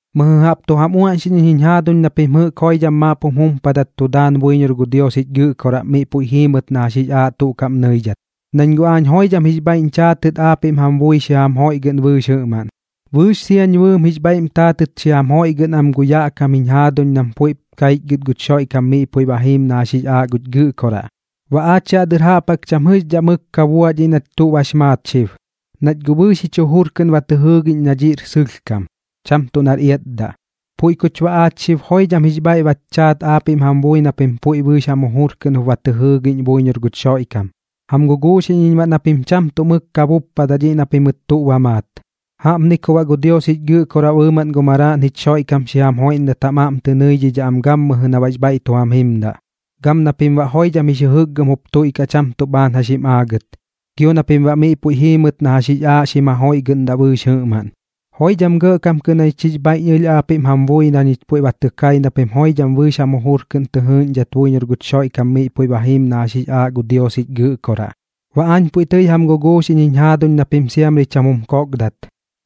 Mɨjɨ jaꞌp tu jam uaꞌñxiꞌñ iñ jiñ jaaduñ na pim jɨꞌk joidham maap jum jumpadat tu daan buiñor gu Dios jich Gɨꞌkoraꞌ miꞌ puiꞌ jiimɨt na jax jix aaꞌ tuꞌ kaꞌm nɨidhat, nañ guꞌ aañ joidham jix bhaiꞌñ chaatɨt aapiꞌm jam bui xi jam joiꞌgɨꞌn bɨɨx jɨꞌmaꞌn. Bɨɨx siañ bɨɨm jix bhaiꞌm taatɨt xi jam joiꞌgɨꞌn am gu yaꞌ kam jiñ jaaduñ nam puiꞌp kaichgɨt guch Xoiꞌkam miꞌ puiꞌ ba jiim na jax jix aaꞌ guch Gɨꞌkoraꞌ. Baꞌ aach yaꞌ dɨr jaꞌp jaꞌk cham jɨꞌxdhaꞌ mɨk ka buaꞌ dhiꞌ nach tuꞌ bax maat xib, nach guꞌ bɨɨx jich jujur kɨꞌn ba tɨ jɨɨgiꞌñ na dhiꞌr sɨlhkam, cham tuꞌ nar iatdaꞌ. Puiꞌ kuch baꞌ xib joidham jix bhaiꞌ bach chaat aapiꞌm jam bui na pim puiꞌ bɨɨx jam jujur kɨꞌn jup ba tɨ jɨɨgiꞌñ buiñor guch Xoiꞌkam. Jam guguuxiꞌñ iñ baꞌ na pim cham tuꞌ mɨk ka buppadaꞌ dhiꞌ na pimɨt tuꞌ ba maat. Jaꞌpni ku baꞌ gu Dios jich Gɨꞌkoraꞌ bɨɨmaꞌn gu Maraaꞌn jich Xoiꞌkam xi jam joiꞌndat jam aꞌm tɨ nɨidhidhaꞌ am gammɨjɨ na baꞌx bhaiꞌ tu jam jimdaꞌ, gam na pim baꞌ joidham jix jɨjɨkgɨm jup tuiꞌkaꞌ cham tuꞌ bhaan jax jim aagɨt, gio na pim baꞌ miꞌ puiꞌ jiimɨt na jax jix aaꞌ xim jajoiꞌgɨꞌndaꞌ bɨɨx jɨꞌmaꞌn. Joidham gɇꞌkam kɨꞌn jañich jix bhaiꞌñ ɨlh aapiꞌm jam bui na ñich puiꞌ ba tɨ kai na pim joidham bɨɨx jam jujur kɨꞌn tɨ jɨɨꞌñdhat buiñor guch Xoiꞌkam miꞌ puiꞌ ba jiim na jax jix aaꞌ gu Dios jich Gɨꞌkoraꞌ. Baꞌ aañ puiꞌ tɨi jam guguuxiꞌñ jiñ jaaduñ na pim siamri cham jum kokdat,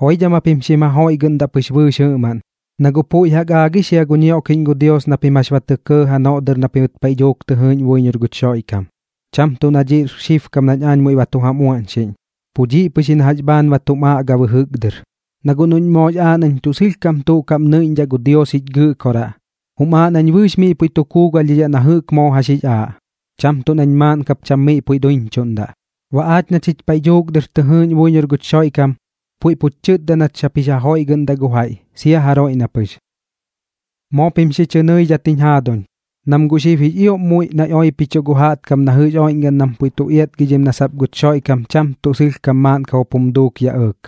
joidham japim xim jajoiꞌgɨꞌndaꞌ pɨx bɨɨx jɨꞌmaꞌn, na guꞌ puiꞌ jaꞌk aagix jia gu ñioꞌkiꞌñ gu Dios na pim jax ba tɇ kɇɇ janoꞌ dɨr na pimɨt paiꞌ dhuuk tɨ jɨɨꞌñ buiñor guch Xoiꞌkam. Cham tuꞌ na dhiꞌr xibkam nañ aañ muiꞌ ba tu jam uaꞌñxiꞌñ, pu dhiꞌ pɨx ji na jax bhaan ba tum aꞌga bɨjɨk dɨr. Na guꞌ noꞌñ moox aaꞌ nañ tuꞌ sɨlhkam tuꞌ kaꞌm nɨiꞌñdhaꞌ gu Dios jich Gɨꞌkoraꞌ, jum aaꞌ nañ bɨɨx miꞌ puiꞌ tu kuugalhdhidhaꞌ na jɨꞌk moo jax jix aaꞌ, cham tuꞌ nañ maaꞌn kap cham miꞌ puiꞌ duiñchuꞌndaꞌ. Baꞌ aach na chich paiꞌ dhuuk dɨr tɨ jɨɨꞌñ buiñor guch Xoiꞌkam, puiꞌ puch chɨtda nach sap jix ja joiꞌgɨꞌndaꞌ gu jaiꞌ, sia jaroiꞌ na pɨx. Moo pim xi chɨ nɨidhat jiñ jaaduñ, nam guꞌ xib jix ioꞌm muiꞌ naiꞌ oipichuꞌ gu jaꞌtkam na jɨꞌx oiꞌñgaꞌn nam puiꞌ tu iatgidhim nat sap guch Xoiꞌkam cham tuꞌ sɨlhkam maaꞌnkam jup jum duuk yaꞌ ɇɇk,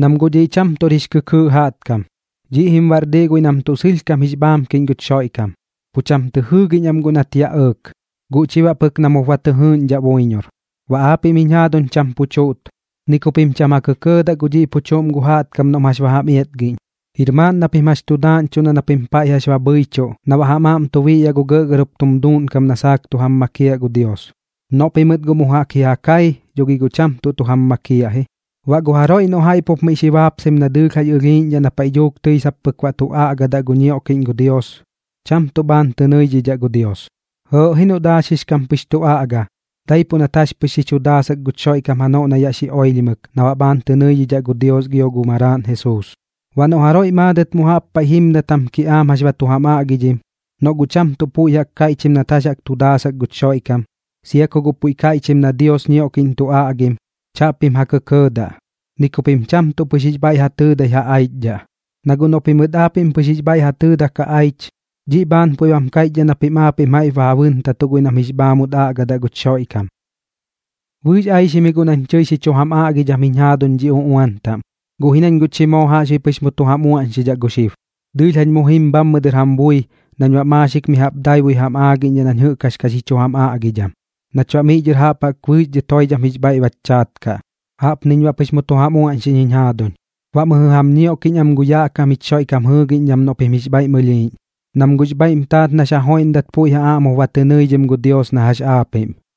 nam guꞌ dhiꞌ cham tuꞌr jix kɨkɨɨꞌ jaꞌtkam. Dhiꞌ jim baꞌ bar diꞌ guiꞌ nam tuꞌ sɨlhkam jix bhaamkiꞌñ guch Xoiꞌkam, pu cham tɨ jɨɨgiꞌñ am guꞌ nat yaꞌ ɇɇk, guꞌ chi baꞌ pɨk nam jup ba tɨ jɨɨꞌñdhaꞌ buiñor. Baꞌ aapiꞌm jiñ jaaduñ cham pu chuꞌt, ni ku pim cham ja kɇkɇɇdaꞌ gu dhiꞌ pu chuꞌm gu jaꞌtkam noꞌm jax jam iatgiꞌñ. Jir maaꞌn na pim jax tu daaꞌñchuꞌn na pim paiꞌ jax ba bhɨichuꞌ na baꞌ jam aꞌm tu biꞌyaꞌ gu gɇꞌgɇr jup tum duuꞌnkam na saak tu jam makiaꞌ gu Dios. Noꞌ pimɨt guꞌ mu jaꞌk ji ja kai, dho gi guꞌ cham tuꞌ jam makiaꞌ ji. Baꞌ gu jaroiꞌ noꞌ jaiꞌ pup miꞌ xi baapsaim na dɨɨlh jax ɨlhiiꞌñdhaꞌ na paiꞌ dhuuk tɨi sap pɨk baꞌ tu aꞌgadaꞌ gu Dios ñioꞌkiꞌñ, cham tuꞌ bhaan tɨ nɨidhidhaꞌ gu Dios. Jɨɨꞌ ji noꞌ daaxix kam pɨx tu aꞌga, daipuꞌ nat jax pɨx xi chu daasak guch Xoiꞌkam janoꞌ na yaꞌ xi oilhimɨk na baꞌ bhaan tɨ nɨidhidhaꞌ gu Dios gio gu Maraaꞌn Jesuus. Baꞌ noꞌ jaroiꞌ maadɨt mu jaꞌp paiꞌ jimdat jam kiꞌaam jax ba tu jam aꞌgidhim, noꞌ guꞌ cham tuꞌ puiꞌ jaꞌk kaiꞌchim nat jax tu daasak guch Xoiꞌkam, sia ku guꞌ puiꞌ kaiꞌchim na Dios ñioꞌkiꞌñ tu aꞌgim, chaꞌpim ja kɇkɇɇdaꞌ, ni ku pim cham tuꞌ pɨx jix bhaiꞌ ja tɨɨdai ja aichdhaꞌ. Na guꞌ noꞌ pimɨt aapiꞌm pɨx jix bhaiꞌ ja tɨɨdak ja aich, dhiꞌ bhaan puiꞌ bam kaiꞌchdhaꞌ na pim jaiꞌp ba ja bɨntatuꞌ guiꞌ nam jix bhaamut aꞌgadaꞌ guch Xoiꞌkam. Bɨɨx aixim ji guꞌ nañ tɨi xi chu jam aꞌgidham jiñ jaaduñ dhi uꞌuan taꞌm, guꞌ ji nañ guꞌ chi moo jaꞌxbuiꞌ pɨx mu tu jam uaꞌñxidhaꞌ gu xib. Dɨɨlh jañ mu jim bhammɨ dɨr jam bui nañ baꞌ maaxik mi jaꞌp daibui jam aagiꞌñdhaꞌ nañ jɨꞌk jax ka xi chu jam aꞌgidham, nach baꞌ miꞌ dhɨr jaꞌp jaꞌk bɨɨx dhɨt joidham jix bhaiꞌ bach chaat kaꞌ. Jaꞌpniñ baꞌ pɨx mu tu jam uaꞌñxiꞌñ jiñ jaaduñ. Baꞌ mɨjɨ jaꞌp jam ñioꞌkiꞌñ am gu yaꞌ kam jich Xoiꞌkam jɨɨgiꞌñdham noꞌ pim jix bhaiꞌm ɨlhiiꞌñ, nam guꞌx bhaiꞌm taat nax ja joiꞌndat puiꞌ ja aꞌm jup ba tɨ nɨidhim gu Dios na jax aapiꞌm.